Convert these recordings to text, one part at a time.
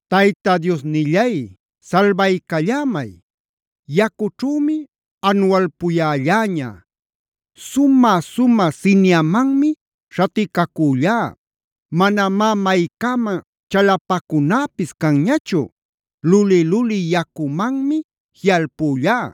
Tayta Diosnillay, salbaycallämay. Yacućhümi anualpuyälläña. Sumä-sumä siniamanmi śhaticacüllá. Manamá maycäman chalapacunäpis canñachu. Luli-luli yacumanmi jiꞌalpüllá;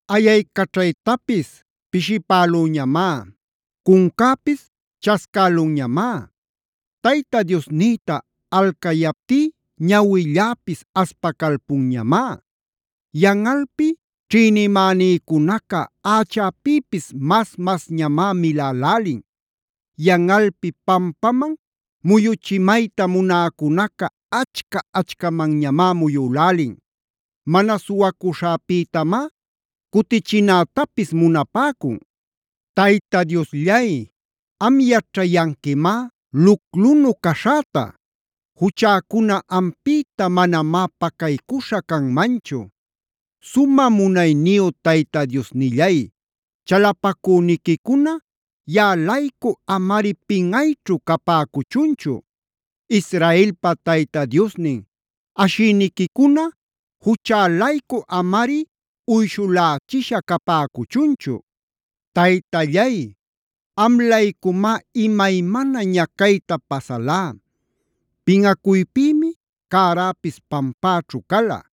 Ayaycaćhaytapis pishipälüñamá. Cuncäpis chascälunñamá. Tayta Diosnïta alcayaptí ñawilläpis aspacalpunñamá. Yanꞌalpi ćhïnimänïcunaca ächäpïpis mas-masñamá milälälin.b Yanꞌalpi pampaman muyuchimayta munäcunaca achca-achcamanñamá muyülälin. Mana suwacuśhäpïtamá cutichinätapis munapäcun. Tayta Diosllay, am yaćhayanquimá luclunu caśhäta. Juchäcuna ampïta manamá pacaycuśha canmanchu. Sumä munayniyu Tayta Diosnillay, chalapacüniquicuna yaꞌa-laycu amari pinꞌayćhu capäcuchunchu. Israelpa Tayta Diosnin, ashïniquicuna juchä-laycu amari uyshulächisha capäcuchunchu. Taytallay, am-laycumá imaymana ñacayta pasalá. Pinꞌacuypïmi cäräpis pampäćhu cala.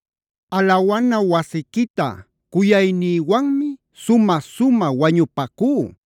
Alawana wasiquita cuyaynïwanmi sumä-sumä wañupacú.d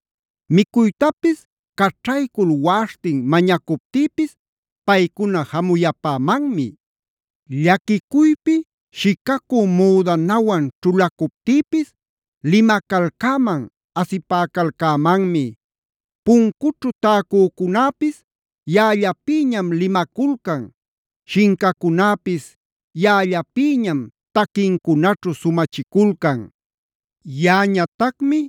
Micuytapis caćhaycul waꞌaśhtin mañacuptïpis paycuna jamuyapämanmi. Llaquicuypi shicacü müdanawan ćhulacuptïpis limacalcäman, asipäcalcämanmi. Puncućhu täcücunäpisf yaꞌallapïñam limaculcan. Shincacunäpis yaꞌallapïñam taquincunaćhu sumachiculcan. Yaꞌañatacmi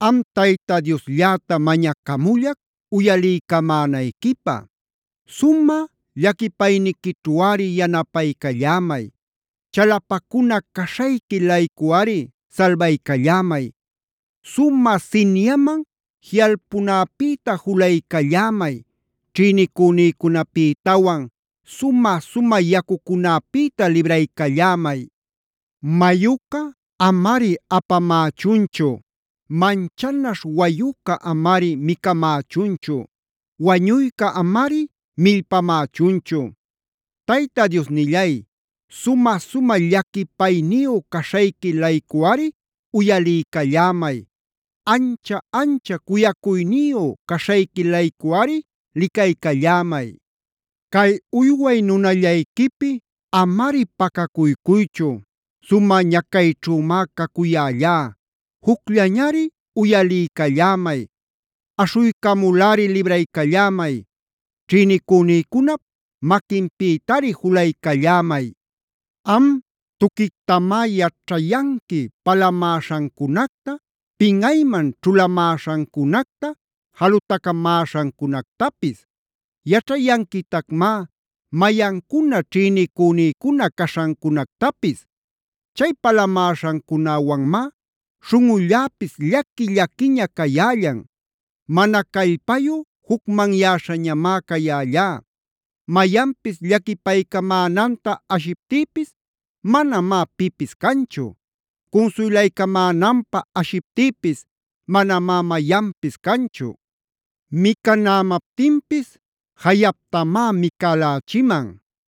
am Tayta Dioslläta mañacamullac uyaliycamänayquipä. Sumä llaquipayniquićhuꞌari yanapaycallämay. Chalapacuna caśhayqui-laycuꞌari salbaycallämay. Sumä siniaman jiꞌalpunäpïta julaycallämay. Ćhïnicünïcunapïtawan sumä-sumä yacucunäpïta libraycallämay. Mayuca amari apamächunchu. Manchanaśh wayuca amari micamächunchu; wañuyca amari millpamächunchu. Tayta Diosnillay, sumä-sumä llaquipayniyu caśhayqui-laycuꞌari uyaliycallämay. Ancha-ancha cuyacuyniyu caśhayqui-laycuꞌari licaycallämay. Cay uyway nunallayquipi amari pacacuycuychu. Sumä ñacayćhümá cacuyällá; jucllañari uyaliycallämay. Aśhuycamulꞌari libraycallämay. Ćhïnicünïcunap maquinpïtari julaycallämay. Am tuquictamá yaćhayanqui palamäśhancunacta, pinꞌayman ćhulamäśhancunacta, jalutacamäśhancunactapis. Yaćhayanquitacmá mayancuna ćhïnicünïcuna caśhancunactapis. Chay palamäśhancunäwanmá śhunꞌulläpis llaqui-llaquiña cayällan. Mana callpayu jucmanyäśhañamá cayällá. Mayanpis llaquipaycamänanta ashiptïpis manamá pipis canchu. Cunsuylaycamänanpä ashiptïpis manamá mayanpis canchu. Micanämaptinpis jayaptamá micälächiman.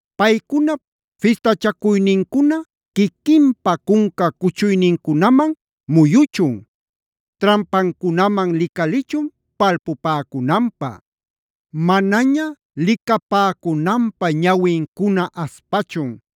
Paycunap fistachacuynincuna quiquinpa cunca cuchuynincunaman muyuchun. Trampancunaman licalichun palpupäcunanpä. Manaña licapäcunanpä ñawincuna aspachun.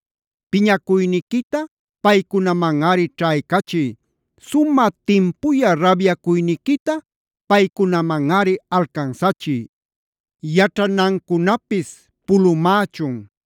Piñacuyniquita paycunamanꞌari ćhaycachiy. Sumä timpuyä rabyacuyniquita paycunamanꞌari alcansachiy. Yaćhanancunapis pulumächun.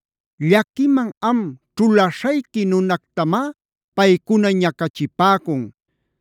Llaquiman am ćhulaśhayqui nunactamá paycuna ñacachipäcun.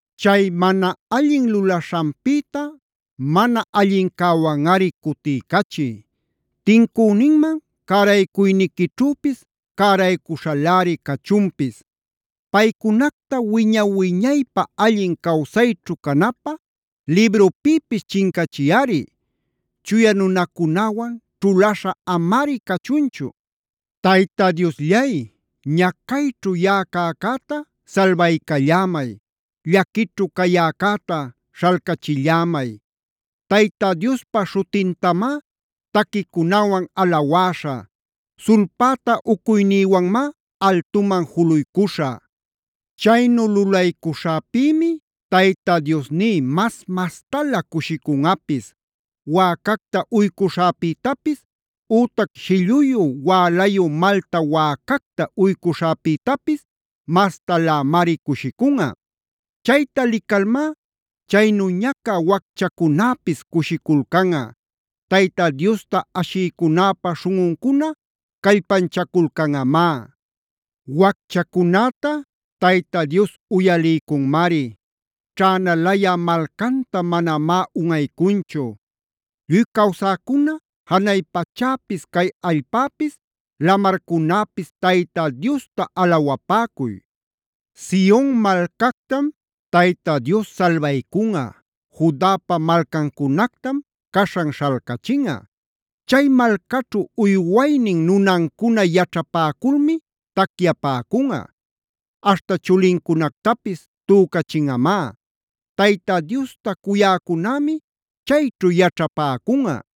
Chay mana allin lulaśhanpïta mana allincäwanꞌari cutiycachiy. Tincüninman cäraycuyniquićhüpis cäraycuśhaläri cachunpis. Paycunacta wiña-wiñaypä allin cawsayćhu canapä librupïpis chincachiyꞌari.k Chuya nunacunäwan ćhulaśha amari cachunchu. Tayta Diosllay, ñacayćhu yaꞌa cäcäta salbaycallämay. Llaquićhu cayäcäta śhalcachillämay. Tayta Diospa śhutintamá taquicunawan alawäśhä. Sulpäta ucuynïwanmá altuman juluycuśhä. Chaynu lulaycuśhäpïmi Tayta Diosní mas-mastalä cushicunꞌapis. Wäcacta uycuśhäpïtapis ütac shilluyu wälayu malta wäcacta uycuśhäpïtapis mastalämari cushicunꞌa. Chayta licalmá chaynu ñacä wacchacunäpis cushiculcanꞌa. Tayta Diosta ashïcunäpa śhunꞌuncuna callpanchaculcanꞌamá. Wacchacunäta Tayta Dios uyaliycunmari. Ćhänalayä malcanta manamá unꞌaycunchu. Lluy cawsäcuna, janay pachäpis, cay allpäpis, lamarcunäpis Tayta Diosta alawapäcuy. Sion malcactam Tayta Dios salbaycunꞌa. Judapa malcancunactam caśhan śhalcachinꞌa. Chay malcaćhu uywaynin nunancuna yaćhapäculmi tacyapäcunꞌa. Aśhta chulincunactapis tücachinꞌamá. Tayta Diosta cuyäcunämi chayćhu yaćhapäcunꞌa.